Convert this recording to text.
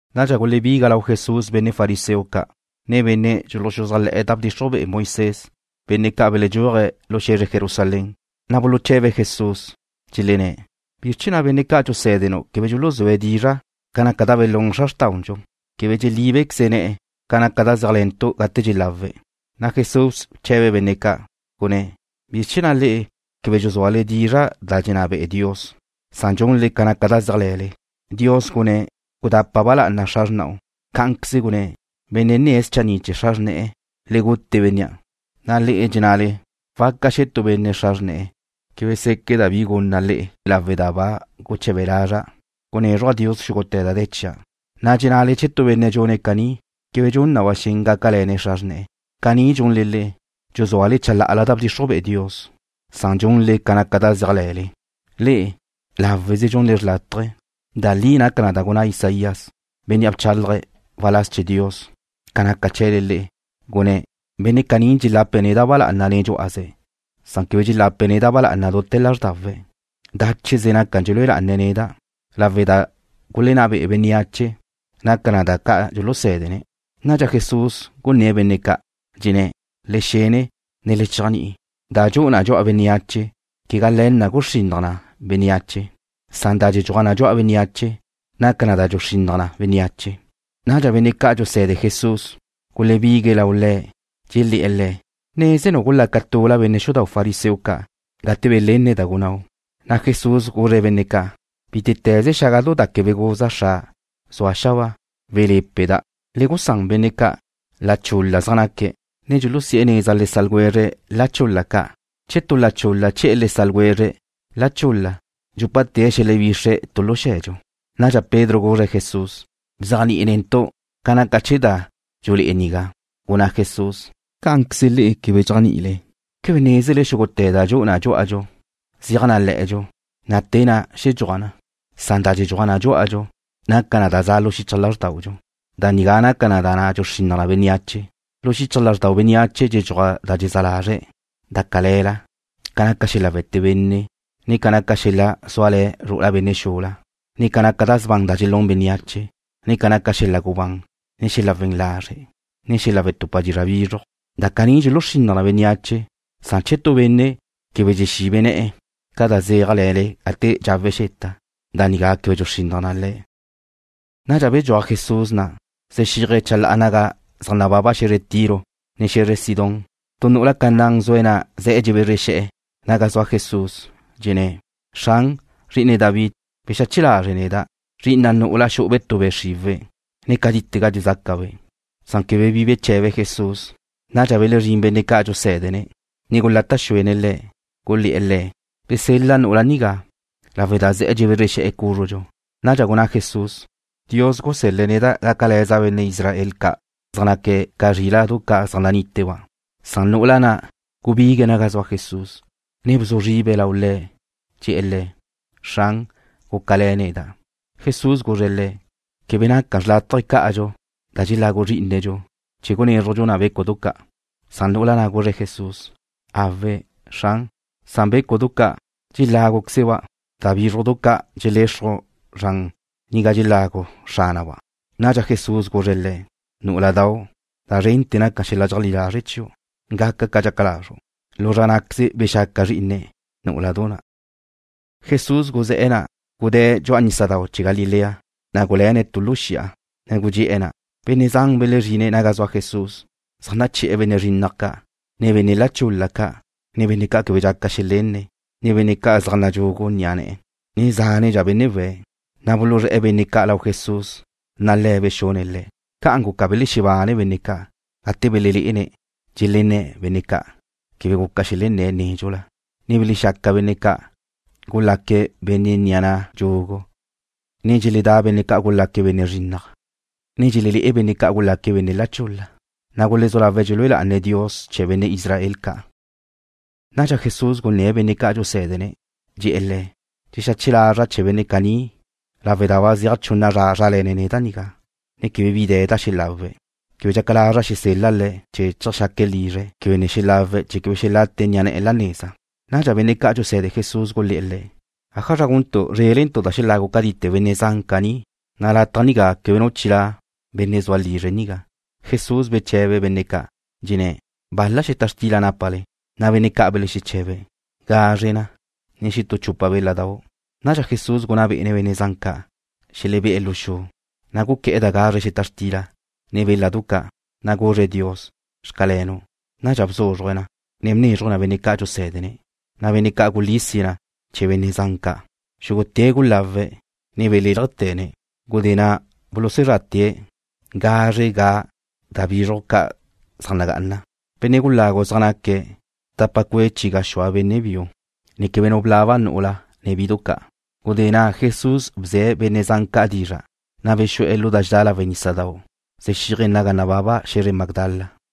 Nadxa benne' fariseo ca', ne benne' dxuluxuzájle̱'e̱ da bdxixruj be'e Moisés, benne' ca' beledxuaje̱' lu xe̱zre Jerusalén, gulebigue̱' lau Jesús, na' buluche̱be̱' Le̱', dxelenné̱': ―¿Bizr chee̱ na' benne' ca' dxusé̱denu' quebe dxuluzúe̱' dizra' ca naca da gulún xra xrtaudxu? Quebe dxelíbequeze ne̱'e̱ ca naca da zéajle̱ntu' gate dxelawe̱'. Jesús bche̱be̱' benne' ca', gunné̱': ―¿Bizr chee̱ na' le'e quebe dxuzuale dizra' da dxenná be'e Dios? Dxunle ca naca da zéajle̱le. Dios gunné̱': “Gudapa ba lá'ana xra xrna'u.” Cá'anqueze gunné̱': “Benne' nne̱' schanni' chee̱ xra xrne̱'e̱, le gute bénnea'.” Le'e dxennale waca xe̱ tu benne' xra xrne̱'e̱: “Quebe séqueda' bi gunna' le'e lawe' da ba guche̱be lazra' gunézruja' Dios xúgute̱ da de̱ chia'.” Dxennale che tu benne' dxune̱' caní québedxa dxun na ba xen gácale̱ne̱' xra xrne̱'e̱. Caní dxunle le'e, dxuzuale chala'ala da bdxixruj be'e Dios, chee̱ gunle ca naca da zéajle̱le. Le'e, láweze dxunle da xrlátaje. Da li naca da gunná Isaías, bénnea' bchálaje̱' waláz chee̱ Dios, ca naca chee̱le le'e, gunné̱': Benne' caní dxelape̱' neda' ba lá'ana nen dxú'aze̱'. Quebe dxelape̱' neda' ba lá'ana dute̱ lázrdawe̱'. Dácheze naca dxelúe lá'ane̱' neda'. Da gulenná be'ene̱' bénneache naca na da ca' dxulusé̱dene̱'. Nadxa Jesús gunné̱' benne' ca', dxenné̱': ―Le xene, ne le chéajni'i. Da dxu'u na dxu'a bénneache quegá le̱ na guxrinnaj na bénneache. Da dxedxuaj na dxu'a bénneache naca na da dxuxrinnaj na bénneache. Nadxa benne' ca' dxuse̱de Jesús gulebigue̱' lau Le̱'. Dxelé̱'e̱ Le̱': ―¿Nézenu' gulaca tula benne' xudau' fariseo ca' gate belenne̱' da gunnáu'? Jesús guzre̱' benne' ca': ―Bítete̱ze xágadau' da quebe guza Xra' zue̱' xabáa, welé̱peda'. Le gusán benne' ca'. La chul-la zaj naque̱', ne dxulusi'e̱ neza le sa' ljwezre̱' la chul-la ca'. Che tu la chul-la che̱'e̱ le sa' ljwezre̱' la chul-la, dxúpate̱' xelebixre̱' tu lu xe̱dxu. Nadxa Pedro guzre̱' Jesús: ―Bzéajni'i netu' ca naca chee̱ da dxulé'e nigá. Gunná Jesús: ―¿Cá'anqueze le'e quebe dxéajni'ile? ¿Quebe nézele xúgute̱ da dxu'u na dxú'adxu zeaj na le̱'e̱dxu, na' te na' xedxuaj na? Da dxedxuaj na dxú'adxu naca na da za' lu xichaj lázrdaudxu. Da nigá naca na da dxuxrinnaj na bénneache. Lu xichaj lázrdau bénneache dxeledxuaj da dxezá lazre̱' da cale̱la, ca naca xel-la' we̱te benne', ne ca naca xel-la' zuale̱ zru'ula benne' xula, ne ca naca da sban da dxelún bénneache, ne ca naca xel-la' gubán, ne xel-la' we̱n lazre', ne xel-la' wetupa dizra' bizruj. Da caní dxuluxrinnaj na bénneache. Che tu benne' quebe dxexibe ne̱'e̱ ca da zéajle̱le gate dxawe̱' xeta, da nigá quebe dxuxrinnaj na le̱'. Nadxa bedxuaj Jesús na', zexíaje̱' chala'a naga zaj nababa xe̱zre Tiro, ne xe̱zre Sidón. Tu nu'ula Canaán zue̱' na' ze̱'e̱ dxebezre xe̱'e̱ cúzrela Jesús, dxenné̱': ―Xran, Zri'ine David, bexache lazre' neda'. Xu'ube' be' xriwe̱' zri'ina' nu'ula, ne cátitega dxezácabe'. Quebe bi beche̱be Jesús. Nadxa belezrín benne' ca' dxusé̱dene̱', ne gulata' xuene̱' Le̱', gulé̱'e̱ Le̱': ―Bsel-la nu'ula nigá lawe' da ze̱'e̱ dxebezre xe̱'e̱ cúzrudxu. Nadxa gunná Jesús: ―Dios gusel-le̱' neda' gácale̱za' benne' Israel ca' zaj naque̱' ca zríla'du ca' zaj naníteba'. Gubiga nu'ula na' naga zua Jesús, ne bzu zribe̱' lau Le̱', ne dxe̱'e̱ Le̱': ―Xran, gúcale̱ neda'. Jesús guzre̱' le̱': ―Quebe naca xrlátaje cá'adxu da dxelagu zrí'inedxu, chee̱ gunézrujdxu na bécudu ca'. Nadxa nu'ula na' guzre̱' Jesús: ―Awe', Xran, san bécudu ca' dxeláguquezeba' da bízrujdu ca' dxelexruj zran naga dxelagu xránaba'. Nadxa Jesús guzre̱' le̱': ―Nú'uladu, da zrente̱ naca xel-la' dxeajlí lazre' chiu'. Gaca ca dxaca lazru'. Lu zra ná'queze bexaca zrí'ine̱' nú'uladu na'. Jesús guzé̱'e̱ na', gudée̱' dxu'a nísadau' chee̱ Galilea. Guluéne̱' tu lu xi'a, ne gudxé'e̱ na'. Benne' zan belezrine̱' naga zua Jesús, zaj naché̱'e̱ benne' zrinnaj ca', ne benne' la chul-la ca', ne benne' quebe dxaca xelenné̱', ne benne' zan zaj nadxugu ni'a na', ne zánedxa benne' we̱'. Buluzré̱'e̱ benne' ca' lau Jesús, na' Le̱' bexune̱' le̱'. Ca'an guca belexebane benne' ca' gate belelé'ene̱' dxelenné̱' benne' ca' quebe guca xelenné̱' nédxula, ne belexexaca benne' ca' gulaque̱' benne' ni'a na' dxugu, ne dxeledá benne' ca' gulaque̱' benne' zrinnaj, ne dxelelé'e benne' ca' gulaque̱' benne' la chul-la. Gulezú lawe̱' dxelúe lá'ane̱' Dios chee̱ benne' Israel ca'. Nadxa Jesús gunné̱' benne' ca' dxusé̱dene̱'. Dxe̱'e̱ le̱': ―Dxexache lazra' chee̱ benne' caní lawe' da ba zeaj chunna zra zrále̱ne̱' neda' nigá, ne quebe bi de̱ da xelawe̱'. Quebe dxaca lazra' xesel-la' le̱' chee̱ cheajxaque̱' lizre̱' quebe ne xelawe̱' chee̱ quebe xelate ni'a ne̱'e̱ la neza. Nadxa benne' ca' dxuse̱de Jesús gulé̱'e̱ Le̱': ―¿Ájazra guntu' zrélentu' da xelagu cátite̱ benne' zan caní? Lataj nigá quebe nu chilá' benne' zua lizre̱' nigá. Jesús bche̱be̱' benne' ca', dxenné̱': ―¿Bal-la xeta xtila nápale? Benne' ca' belexeche̱be̱': ―Gazre na, ne xetú chupa béladau'. Nadxa Jesús gunná bé'ene̱' benne' zan ca' xelebé'e̱ lu xu. Guqué̱'e̱ da gazre xeta xtila, ne béladu ca', na' guzre̱' Dios: “Xcalenu'.” Nadxa bzúzruje̱' na, ne bnézruje̱' na benne' ca' dxusé̱dene̱', na' benne' ca' gulísie̱' na chee̱ benne' zan ca'. Xúgute̱' gulawe̱', ne belélajte̱ne̱'. Gudé na' bulusuzrate̱' gazre ga' da bízrujdu ca' zaj nagá'ana. Benne' gulagu zaj naque̱' tapa cue' chi gaxúa benne' biu, ne quebe nu blaba nu'ula, ne bidu ca'. Gudé na' Jesús bze̱' benne' zan ca' dizra', na' bexu'e̱ lu da dxedá lawe' nísadau' zexíaje̱' naga nababa xe̱zre Magdala.